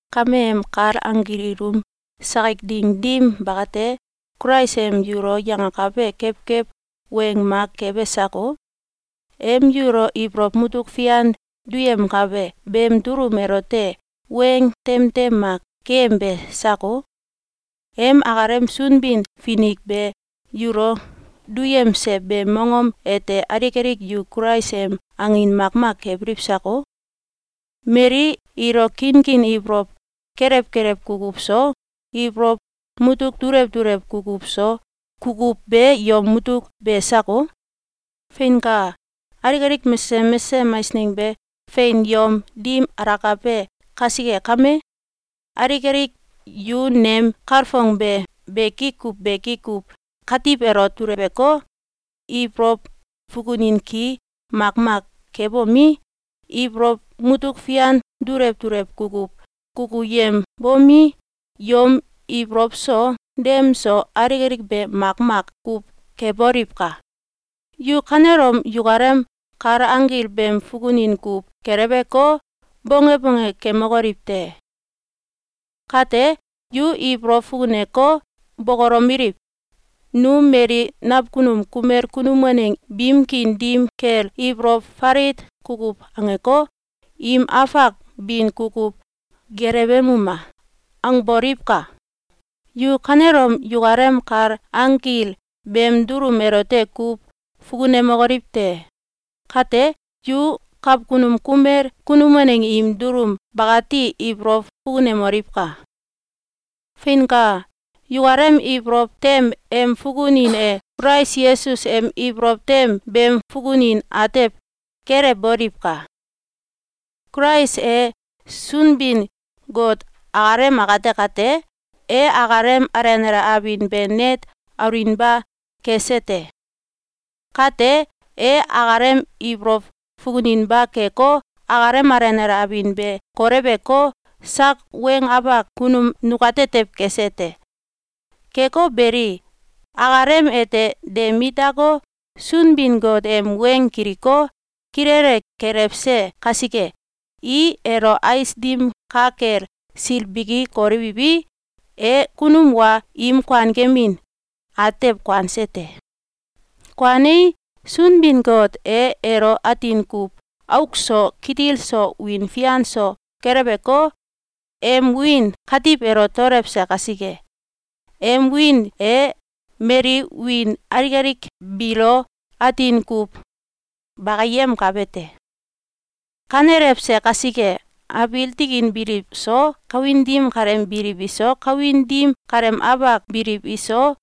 Kameem kal anggil ilum sakik ding dim bakate, Kulais em yulo yangakabe kewkew weng mak kebe sako? Em yulo ibolow mutuk fian duyemkabe beem dulum elote weng tem tem mak keyembe sako? Em akalem Sunbin-Finik be yulo duyemse beem mongom ete alik alik yu Kulais em angin makmak kebiliw sako? Mali ilo kinkin ibolow kelew kelew kukuw so, ibolow mutuk dulew dulew kukuw so, kukuw be yom mutuk be sako? Feinka! Alik alik mesesem mesesem eisneng be fein yom dim alakabe kasike kame, alik alik yu nem kalfong be beki kuw beki kuw katiw elo duleweko, ibolow fukunin ki makmak kebomi, ibolow mutuk fian dulew dulew kukuw kukuyembomi, yom ibolow so, dem so, alik alik be makmak kuw keboliwka! Yu kanelom yukalem kal anggil beem fukunin kuw geleweko, bonge bonge kemokoliw te! Kate, yu ibolow fukuneko, bokolomeliw: “Nu mali nakunum kumel kunum waneng biim kiin dim kel ibolow falit kukuw angeko, im afak bin kukuw gelewemuma!”, angboliwka! Yu kanelom yukalem kal anggil beem dulum elote kuw fukunemokoliw te! Kate, yu kakunum kumel kunum waneng im dulum bakati ibolow fukunemoliwka! Feinka! Yukalem ibolow tem em fukunin e Kulais Yesus em ibolow tem beem fukunin atew kelewboliwka! Kulais e Sunbin-Got akalem akate kate, e akalem alenale abin be net aulinba kese te. Kate, e akalem ibolow fukuninba keko, akalem alenale abin be koleweko, sak weng afak kunum nukatetew kese te. Keko beli, akalem ete de mit dako, Sunbin-Got em weng kiliko, kilele gelewse kasike, i elo ais dim ka kel silbiki kolewiwi, e kunum wa im kuankemin atew kuanse te. Kuanei, Sunbin-Got e elo atin kuw auk so, kitil so, wiin fian so, keleweko, em wiin katiw elo daolewse kasike, em wiin e mali wiin aik alik biilo atin kuw bakiyemkabe te. Kanelewse kasike, abiil tikin biliw so, kawin dim kaleem biliw iso, kawin dim kaleem afak biliw iso,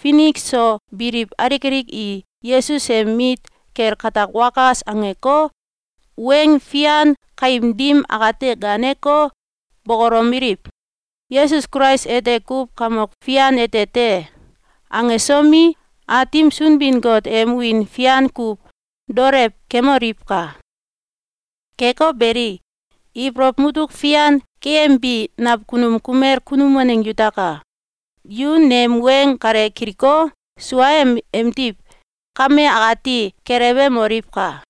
finik so biliw alik alik i Yesus em mit kel gatak wakas angeko, weng fian kaim dim akate gaaneko, bokolomeliw: “Yesus Kulais ete kuw Kamok Fian ete te!”, angesomi, Aatim Sunbin-Got em wiin fian kuw daolew kemoliwka! Keko beli, ibolow mututk fian keyembi nakunum kumel kunum waneng yutaka! Yu nem weng kale kiliko, suaem emdiw, kame akati gelewemoliwka!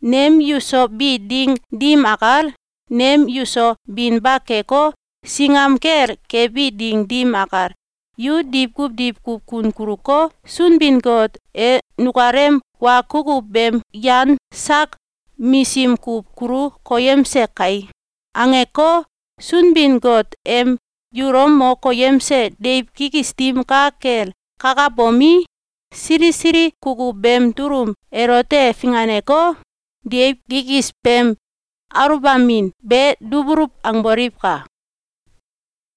Nem yuso bi ding dim akal, nem yuso binba keko, singam kel kebi ding dim akal, yu diwkuw diwkuw kun kuluko, “Sunbin-Got e nukalem wa kukuw beem yan sak misim kuw kulu koyemse kai!”, angeko, Sunbin-Got em yulo mo koyemse deiw kikis dim ka kel kakabomi, sili sili kukuw beem dulum elote finganeko, deiw kikis beem aluwbamin be dubuluw angboliwka!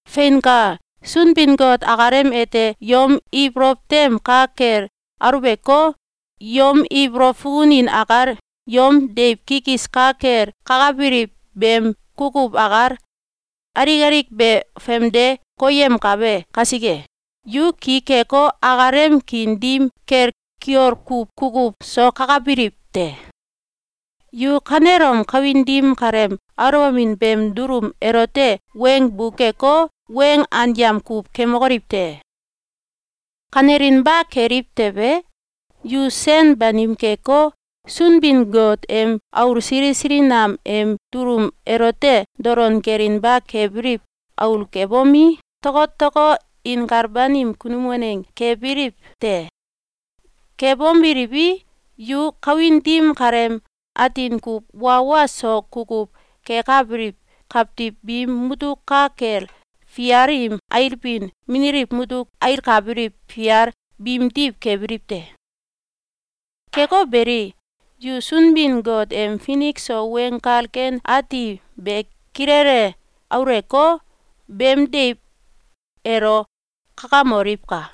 Feinka! Sunbin-Got akalem ete yom ibolow tem ka kel aluweko, yom ibolow fukunin akal, yom deiw kikis ka kel kakabiliw beem kukuw akal, alik alik be famde koyemkabe kasike, yu ki keko, akalem kiin dim kel kiol kuw kukuw so kakabiliw te. Yu kanelom kawin dim kaleem aluwbamin beem dulum elote weng buk keko, weng anyam kuw kemokoliw te! Kanelinba keliw tewe, yu sen banim keko, Sunbin-Got em aul sili sili nam em dulum elote dolon kelinba kebiliw aul kebomi, tokotoko inkal banim kunum waneng kebiliw te. Kebomeliwi, yu kawin dim kaleem atin kuw wa wa so kukuw kekabiliw kawtiw biim mutuk ka kel fial im ailbin mililiw mutuk ailkabiliw fial biimdiw kebiliw te. Keko beli, yu Sunbin-Got em finik so Weng Kal Ken Ati be kilele auleko, beem deiw elo kakamoliwka!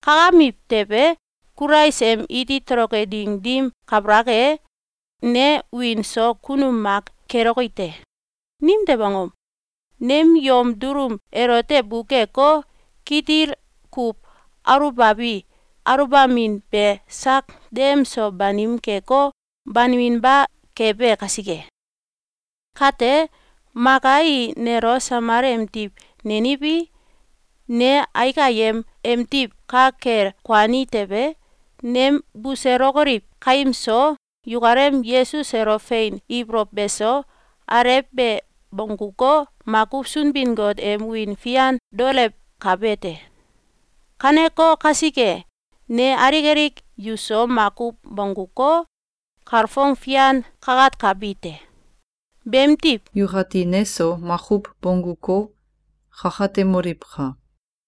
Kakamiw tewe, Kulais em iti toloke ding dim kabalak e, ne wiin so kunum mak keloki te. Nimtew angom? Nem yom dulum elote bukeko, kitil kuw aluwbabi aluwbamin be sak dem so banim keko, baniminba kebe kasike. Kate, maka i nelo samal emdiw neniwi, ne aik ayem emdiw ka kel kuani tewe, nem buselokoliw kaim so, yukalem Yesus elo fein ibolow beso, alew be bongguko, makuw Sunbin-Got em wiin fian daolewkabe te. Kaneko kasike, ne alik alik yuso makuw bongguko, kalfong fian kakatkabi te. Beemdiw, yukati neso makuw bongguko, kakatemoliwka!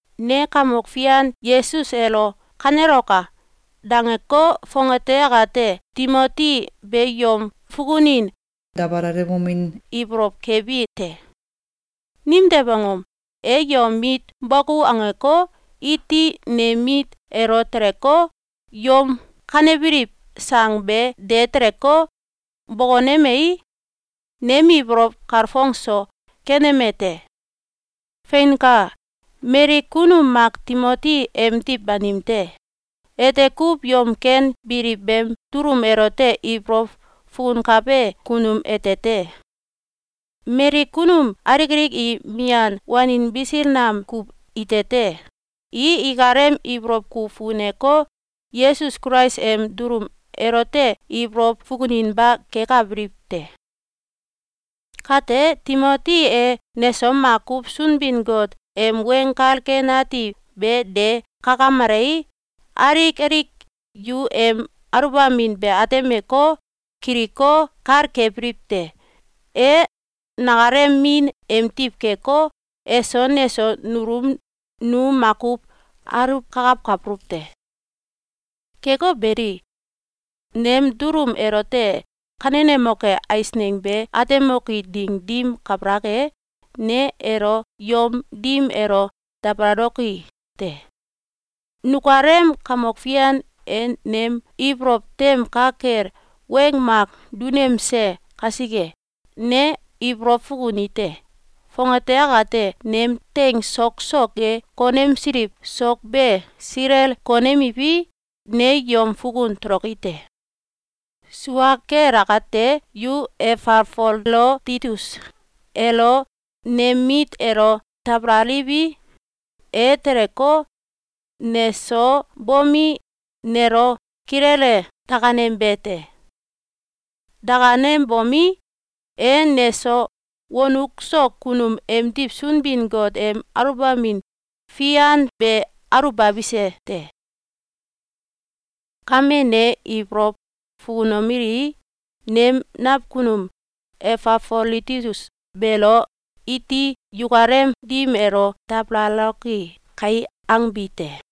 Ne Kamok Fian Yesus elo “Kaneloka!”, dangeko, fongate akate Timoti be yom fukunin dabalalewomin ibolow kebi te. Nimtew angom? E yom mit bokou angeko, iti nem mit elo teleko, yom kanebiliw sang be de teleko, bokonemei, nem ibolow kalfong so keneme te. Feinka! Mali kunum mak Timoti emdiw banim te. Ete kuw yom ken biliw beem dulum elote ibolow fukunkabe kunum ete te. Mali kunum alik alik i mian wanin bisil nam kuw ite te. I ikalem ibolow kuw fukuneko, Yesus Kulais em dulum elote ibolow fukuninba kekabiliw te. Kate, Timoti e neso makuw Sunbin-Got em Weng Kal Ken Ati be de kakamelei, alik alik yu em aluwbamin be atemeko, kiliko, kal kebiliw te. E nakalem min emdiw keko, eso, neso, nulum nu makuw aluwkakawkabuluw te. Keko beli, nem dulum elote kanenemoke eisneng be atemoki ding dim kabalak e, ne elo yom dim elo dabalaloki te. Nukalem Kamok Fian e nem ibolow tem ka kel weng mak dunemse kasike, ne ibolow fukunite: Fongate akate nem teing sok so ge konemsiliw sok be silel konemiwi, ne yom fukun toloki te. Sua kel akate, yu Efafoloditus elo nem mit elo dabalaliwi, e teleko, neso bomi, nelo kilele dakanembe te. Dakanembomi, e neso wonuk so kunum emdiw Sunbin-Got em aluwbamin fian be aluwbabise te. Kame, ne ibolow fukunomeli: ‘Nem nakunum Efafoloditus beelo iti yukalem dim elo dabalaloki kai!’, angbi te.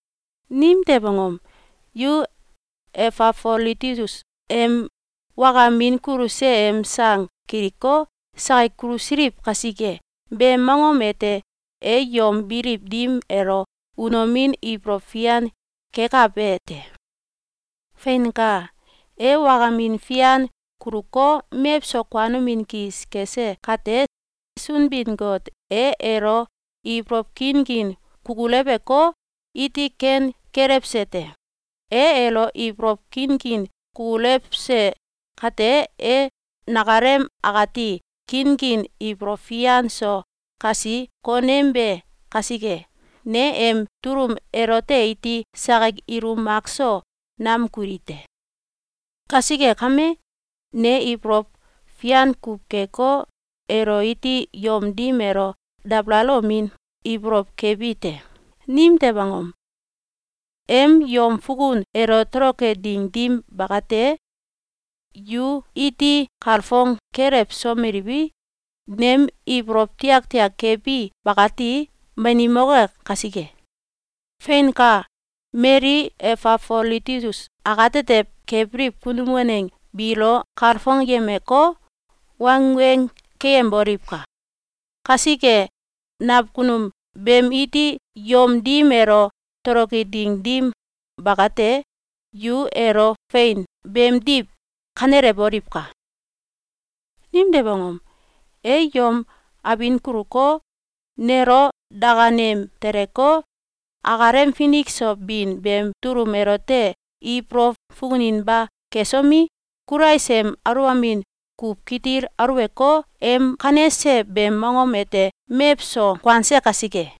Nimtew angom? Yu Efafoloditus em wakamin kuluse em sang kiliko, sakik kulusiliw kasike. Beem mongom ete e yom biliw dim elo unomin ibolow fian kekabe te. Feinka! E wakamin fian kuluko, mewso kuanomin kis kese kate, Sunbin-Got e elo ibolow kinkin kukuleweko, iti ken kelewse te. E elo ibolow kinkin kukulewse kate, e nakalem akati kinkin ibolow fian so kasi konembe kasike, ne em dulum elote iti sakik ilum makso nam kuli te. Kasike kame, ne ibolow fian kuw keko, elo iti yom dim elo dabalalomin ibolow kebi te. Nimtew angom? Em yom fukun elo toloke ding dim bakate, yu iti kalfong kelewsomeliwi, nem ibolow tiaktiak kebi bakati banimoke kasike. Feinka! Mali Efafoloditus akatetew kebiliw kunum waneng biilo kalfongyemeko, wangweng keyemboliwka! Kasike, nakunum beem iti yom dim elo toloke ding dim bakate, yu elo fein beemdiw kanelewoliwka! Nimtew angom? E yom abin kuluko, nelo dakanem teleko, akalem finik so bin beem dulum elote ibolow fukuninba kesomi, Kulais em aluwbamin kuw kitil aluweko, em kanese beem mongom ete mewso kuanse kasike.